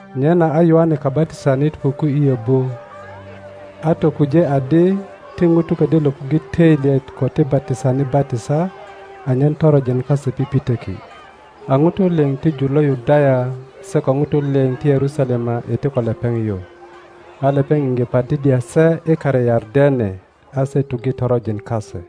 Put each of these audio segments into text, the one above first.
Nyena a Yoane Kabatisanit puku i yobu, a tokuje adi ti ŋutu ködyö löpuŋge toilyet ko ti batisani batisa, anyen toronjin kase pipitoki. A ŋutu liŋ ti jur lo Yudaya, se ko ŋutu lio ti Yerusalema iti ko lepeŋ yu, a lepeŋ iŋge batiddya se i kare Yardene, a se tuŋge toronjin kase.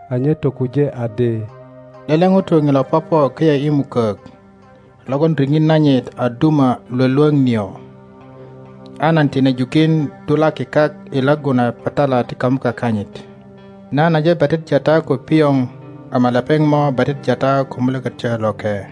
A nye tokuje adi, Lele ŋuto ŋilo popo köyö i mukok logon riŋit nanyit a duma Iwolwoŋ nio, a nan tine jukin dulaki kak i laggu na patala ti kamuka kanyit. Nan aje batiddya ta ko pioŋ ama lepeŋ mo batiddya ta ko Mulökötyo Loke.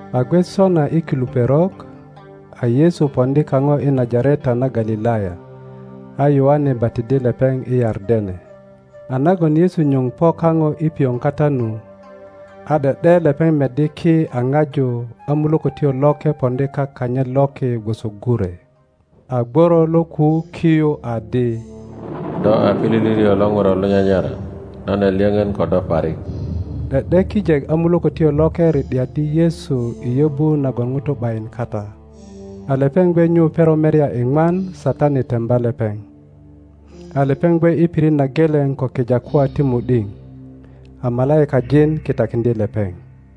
A gwe sona i kilu perok, a Yesu poŋdi kaŋo i Najareta na Galilaya a Yoane batiddye lepeŋ i Yardene. A nagon Yesu nyuŋ po kaŋo i pioŋ kata nu, a ’de ’de lepeŋ meddi ki a ŋaju a Mulökötyo Loke poŋdi kak kanyit loki gwoso gure. A gworo lo kuu ki yu adi, Do a pilili lio lo ŋuro lo nyanyara, nan a lyöŋön ko do parik. ’De ’de kijek a Mulökötyo Loke ri ’diaddi Yesu i yöbu nagon ŋutu ’bayin kata. A lepeŋ gwe nyu perok merya iŋwan Satani temba lepeŋ. A lepeŋ gwe i pirit na geleŋ ko kijakwa ti mu ’diŋ, a malaikajin kitakiŋdye lepeŋ.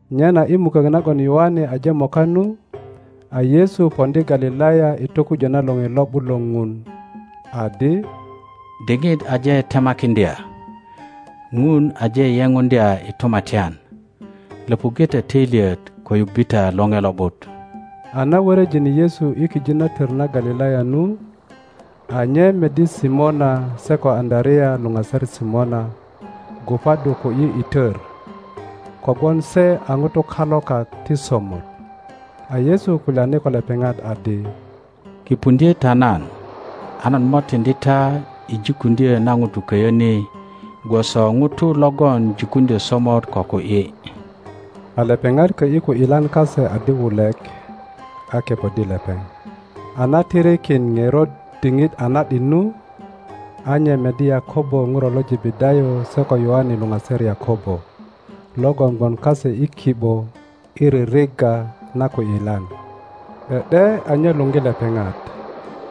Nyena i mukok nagon Yoane aje moka nu, a Yesu poŋdi Galilaya i tokujö na lore lo ’but lo Ŋun, adi, diŋit aje temakiŋdya; Ŋun aje yepuŋdya i tumatyan; löpuŋge ta töilyet ko yubbe ta lore Lo ’but. A na wöröjine Yesu i kijit na tor na Galilaya nu, a nye meddi Simona se ko Aŋöarea luŋaser Simona gubaddu ku ’yi i tor, kogwon se a ŋutu kalokak ti somot. A Yesu kulyani ko lepeŋat adi, Kipuŋdye ta nan, a nan mo tiŋdi ta i jikuŋdyo na ŋutu köyö ni gwoso ŋutu logon jikuŋdyo somot ko ku ’yi. A lepeŋat kö ’yi ku ’yilan kase adi wulek, a kepoddi lepeŋ. A na tirikin ŋerot diŋit a na ’dit nu, a nye meddi Yakobo ŋuro lo Jebedayo se ko Yoane luŋaser Yakobo, logon gwon kase i ki ’bo i ririgga na ku ’yilan. ’De ’de a nye luŋgi lepeŋat,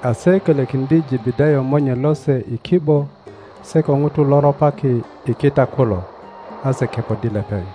a se kölökiŋdye Jebedayo monye lose i ki ’bo se ko ŋutu lo ropaki i kita kulo, a se kepoddi lepeŋ.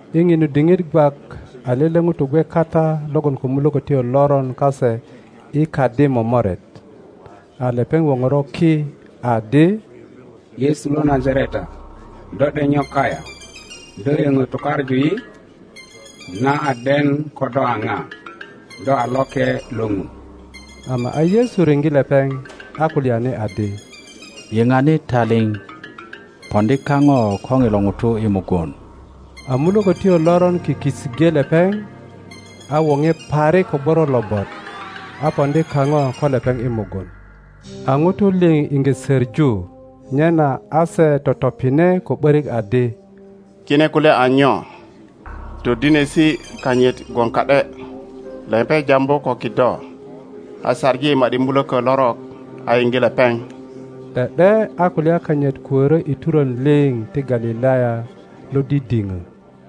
I ŋinu diŋit gwak a lele ŋuto gwe kata logon ko mulökotyo loron kase i kadi momoret. a lepeŋ woŋoro ki adi, Yesu lo Najareta, do ’dek nyo kayaŋ? Do yöŋö tukaŋu yi? Nan a den ko do a ŋa, do a Loke lo Ŋun. Ama a Yesu riŋge lepeŋ, a kulyani adi, Yiŋani taliŋ, poŋdi kaŋo ko ŋilo ŋuto i mugun. a mulökotyo loron kiki iŋge lepeŋ, a woŋe parik ko gworo lobot, a poŋdi kaŋo ko lepeŋ i mugun. A ŋutu liŋ iŋge söŋu, nyena a se totopine ko ’börik adi, Kine kulya a nyo? Todinesi kanyit gwon ka ’de! Lepeŋ jambu ko kido, a saŋi ma ’di mulöko lorok a yiŋge lepeŋ. ’De ’de a kulya kanyit kuorö i turon liŋ ti Galilaya lo didiŋö.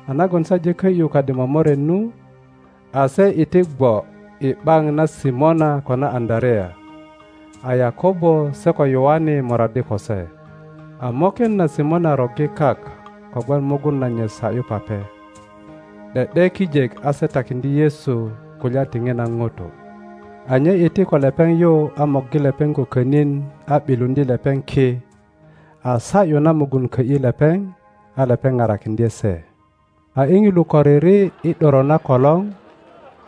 A nagon se aje kö ’yu kadi momoret nu, a se iti gwo i ’baŋ na Simona ko na Aŋöarea; a Yakobo se ko Yoane moraddi ko se. A moken na Simona roggi kak kogwon mugun nanyit sa ’yu pape. ’De ’de kijek a se takiŋdye Yesu kulya ti ŋina ŋuto. a nye iti ko lepeŋ yu a morgi lepeŋ ko könin a ’biluŋdye lepeŋ ki, a sa ’yu na mugun kö ’yi lepeŋ, a lepeŋ parakiŋdye se. A i ŋilu koriri i ’doro na kolor,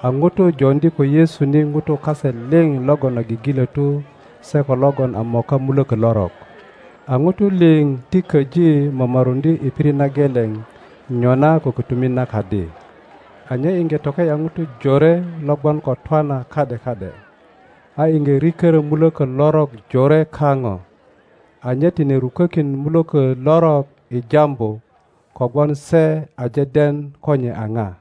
a ŋutu joŋdi ko Yesu ni ŋutu kase Liŋ logon a gigilötu se ko logon a moka mulöko lorok. a ŋutu liŋ ti köji momoruŋdye i pirit na geleŋ nyona ko kötumit na kadi. a nye iŋge toke ’ya ŋutu jore lo gwon ko twana ka ’de ka ’de, a iŋge rikörö mulökö lorok jore kaŋo, a nye tine rukokin mulökö lorok i jambu, kogwon se aje den ko nye a ŋa.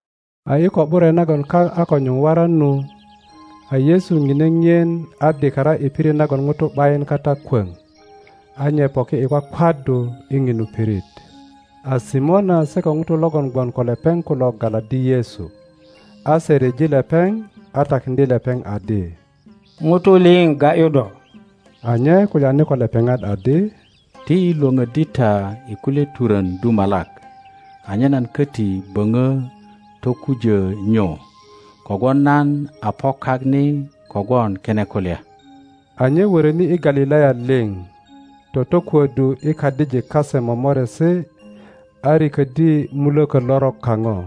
A i ko ’bure nagon kak a ko nyuŋ waran nu, a-Yesu ŋine ŋien a dikara i pirit nagon ŋutu ’bayin kata kwoŋ, a nye poki i kwakwaddu i ŋinu pirit. A Simona se ko ŋutu logon gwon ko lepeŋ kulo galaddi Yesu, a se ryeji lepeŋ, a takiŋdye lepeŋ adi, ŋutu liŋ ga ’yu do. a nye kulyani ko lepeŋat adi, Ti yi Iwoŋöddi ta i kulye turön dumalak, anyen nan köti böŋö tokujö nyu, kogwon nan a po kak ni kogwon kine kulya. A nye wöröni i Galilaya liŋ, totokuöddu i kadijik kase momoresi a riköddi mulökö lorok kaŋo.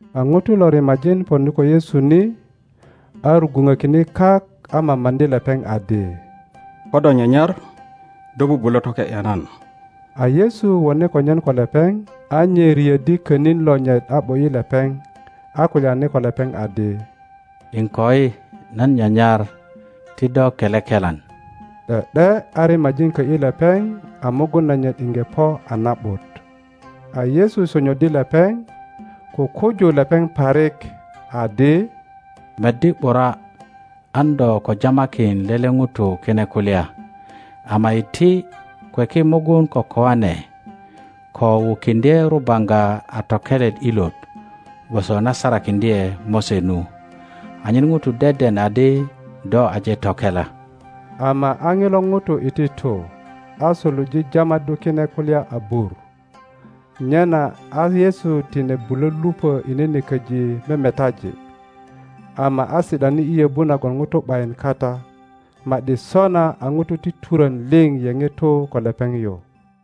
A ŋuto lo rimajin poŋdi ko Yesu ni, a rugwuŋökine kak a mamaŋdi lepeŋ adi, Ko do nyanyar, do bubulo toke ’ya nan. a Yesu wone konyen ko lepeŋ, a nye riöddi könin lonyit a ’bo ’yi lepeŋ, a kulyani ko lepeŋ adi, Iŋkoi, nan nyanyar; ti do kele kelan. ’De ’de a rimajin kö ’yi lepeŋ, a mugun nanyit iŋge po a na ’but. A Yesu sonyoddi lepeŋ, kukuju lepeŋ parik, adi, Meddi ’bura, an do ko jamakin lele ŋuto kine kulya; ama iti, kweki mugun ko koane ko wukiŋdye rubaŋga a tokelet ilot gwoso na sarakiŋdye Mose nu, anyen ŋutu deden adi do aje tokela. Ama a ŋilo ŋuto iti tu, a suluje jamaddu kine kulya abur, nyena a Yesu tine bulo lupö i nene köji memetaji ama a si ’dani i yöbu nagon ŋutu ’bayin kata, ma ’di sona a ŋutu ti turön liŋ yeŋe tu ko lepeŋ yu.